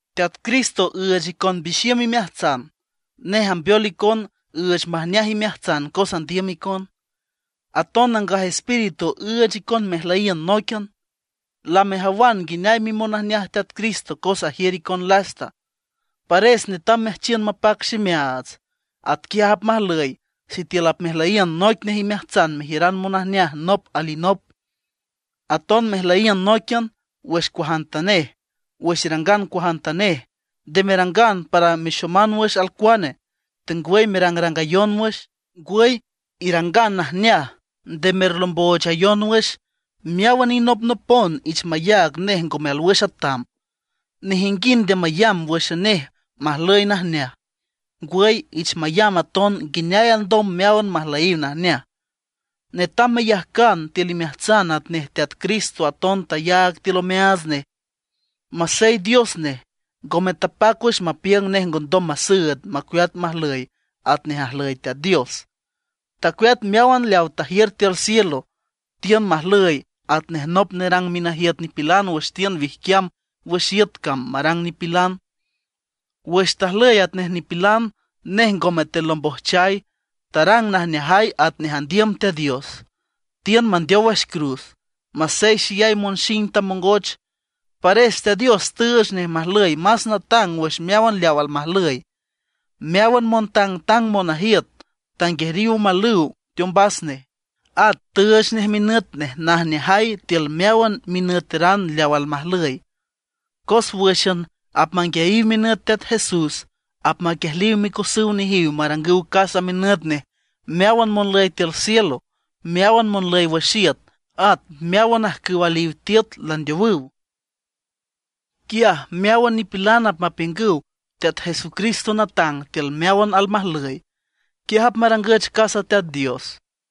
Teat Cristo üüch icon mbixiüm imeajtsan; nej ambeol icon üüch majneaj imeajtsan cos andiüm icon; aton Nangaj Espíritu üüch icon mejlüyiün nóiquian. Lamejawan nguineay mimonajneaj Teat Cristo cos ajiür icon lasta. Pares netam meajchiün mapac ximeaats. Atquiaj apmajlüy sitiül apmejlüyiün noic nej imeajtsan merjiüran monajneaj nop alinop, aton mejlüyiün nóiquian wüx cuajantanej. Wüx irangan cuajantanej, nde merangan para mexoman wüx alcuane, tengwüy merangrangayon wüx; ngwüy irangan najneaj, nde merlomboochayon wüx. Meáwan inopnopon ich mayaag nej ngome alwüx atam. Nejinguind nde mayamb wǘxan nej majlüy najneaj, ngwüy ich mayamb aton nguineay alndom meáwan majlüyiw najneaj. Netam meyajcan tiül imeajtsan atnej Teat Cristo aton tayaag tiül omeaats nej. Masey Dios nej, ngome tapac wüx mapiüng nej ngondom masüüd macueat majlüy atnej ajlüy Teat Dios. Tacueat meáwan leaw tajiür tiül cielo; tiün majlüy atnej nop nerang minajiüt nipilan wüx tiün wijquiam wüx iüt cam marang nipilan. Wüx tajlüy atnej nipilan, nej ngome telombojchay; tarang najneajay atnej andiüm Teat Dios; tiün mandeow wüx cruz, masey xeyay monxing tamongoch. Pares Teat Dios tüüch nej majlüy más natang wüx meáwan leaw almajlüy, meáwan montangtang monajiüt tanguejriw omalüw teombas nej; at tüüch nej minüt nej najneajay tiül meáwan minüteran leaw almajlüy. Cos wǘxan apmanguiayiw minüt Teat Jesús apmaquiejliw micosüw nejiw marangüw casa minüt nej meáwan monlüy tiül cielo, meáwan monlüy wüx iüt, at meáwan ajcüw aliw tiüt landeowüw. Quiaj meáwan nipilan apmapiüngüw Teat Jesucristo natang tiül meáwan almajlüy, quiaj apmarangüch casa Teat Dios.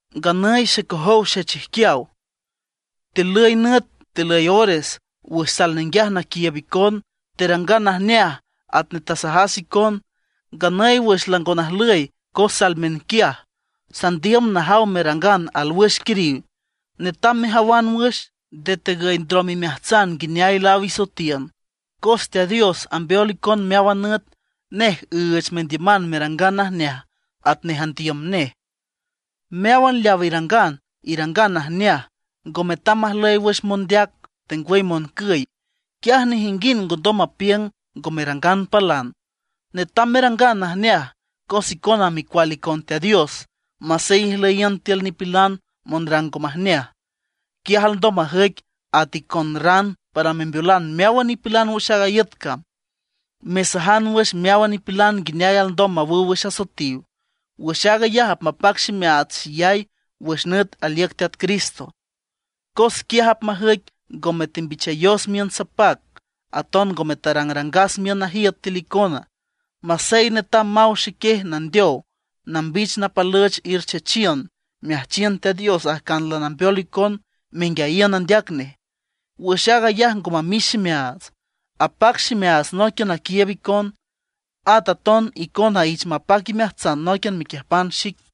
Nganüy xecojow xechijquiaw, tilüy nüt tilüy ores wüx sal ninguiaj naquiiüb icon, terangan najneaj atnej tasajas icon. Nganüy wüx lango najlüy cos sal miünquiaj, sandiüm najaw merangan alwüx alquiriw. Netam mejawan wüx, nde tegüy ndrom imeajtsan nguineay laáw isoetiün. Cos Teat Dios ambeol icon meáwan nüt, nej üüch mendiüman merangan najneaj atnej andiüm nej. Meáwan leaw irangan, irangan najneaj, ngo metam majlüy wüx mondeac, tengwüy moncüy. Quiaj nejinguind ngondom mapiüng ngo merangan palan. Netam merangan najneaj, cos icona micual icon Teat Dios masey ijlüyiün tiül nipilan monrang ngo majneaj. Quiaj alndom majüic at icon ran para membeolan meáwan nipilan wüx aaga iüt cam, mesajan wüx meáwan nipilan nguineay alndom mawüw wüx asoetiw. Wüx aag ayaj apmapac ximeaats xeyay wüx nüt aliüc Teat Cristo, cos quiaj apmajüic ngome tembichayos miün sapac, aton ngome tarangrangas miün najiüt tiül icona. Masey netam maw xequiej nandeow nambich napalüch erchechiün, meajchiün Teat Dios ajcan lanambeol icon menguiayiün andeac nej. Wüx aag ayaj ngo mamix ximeaats, apac ximeaats nóiquian naquiiüb icon. At aton icona ich mapac imeajtsan nóiquian mequiüjpan xic.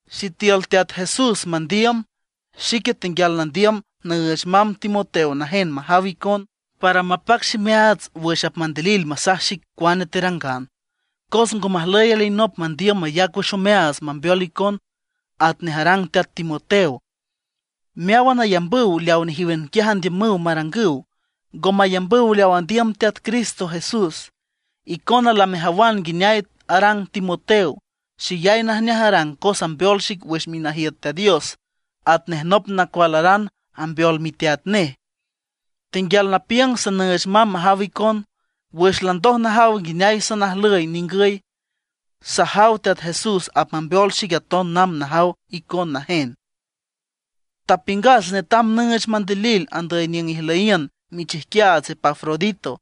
Sitiül Teat Jesús mandiüm, xique tenguial nandiüm nüüch mamb Timoteo najen majaw icon, para mapac ximeaats wüx apmandilil masaj xic cuane terangan. Cos ngo majlüy alinop mandiüm mayac wüx omeaats mambeol icon atnej arang teat Timoteo. Meáwan ayambüw leaw nejíwan quiaj andiümüw marangüw, ngo mayambüw leaw andiüm Teat Cristo Jesús. Icona lamejawan nguineay arang Timoteo; xeyay najneaj arang cos ambeol xic wüx minajiüt Teat Dios atnej nop nacualaran ambeol miteat nej. Tenguial napiüng sanüüch mamb majaw icon, wüx landoj najaw nguineay sanajlüy ningüy. Sajaw Teat Jesús apmambeol xic aton namb najaw icon najen. Tapiüngas netam nüüch mandilil andüy niüng ijlüyiün michijquiaats Epafrodito,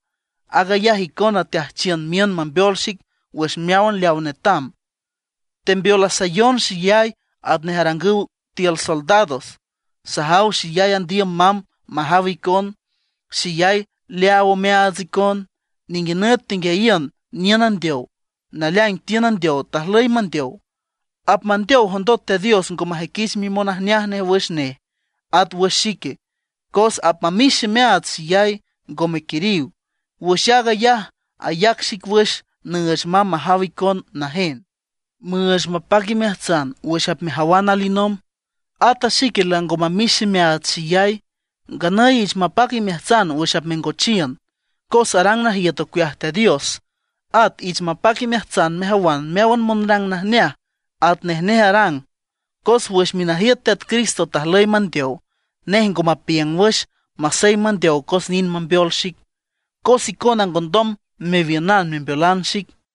aag ayaj icona teajchiün miün mambeol xic wüx meáwan leawa netam. Tembeolasayon xeyay atnej arangüw tiül soldados. Sajaw xeyay andiüm mamb majaw icon, xeyay leaaw omeaats icon. Ninguinüt tenguiayiün niün andeow. Naleaing tiün andeow, tajlüy mandeow. Apmandeow jondot Teat Dios ngo majüiquich mimonajneaj nej wüx nej, at wüx xique, cos apmamix ximeaats xeyay, ngome quiriw. Wüx aag ayaj ayac xic wüx nüüch mamb majaw icon najen, müüch mapac imeajtsan wüx apmejawan alinomb; ata xique lango mamix ximeaats xeyay. Nganüy ich mapac imeajtsan wüx apmengochiün, cos arang najiüt ocueaj Teat Dios. At ich mapac imeajtsan mejawan meáwan monrang najneaj atnej nej arang. Cos wüx minajiüt Teat Cristo tajlüy mandeow. Nej ngo mapiüng wüx, masey mandeow cos nind mambeol xic, cos icona ngondom mewiünan membeolan xic.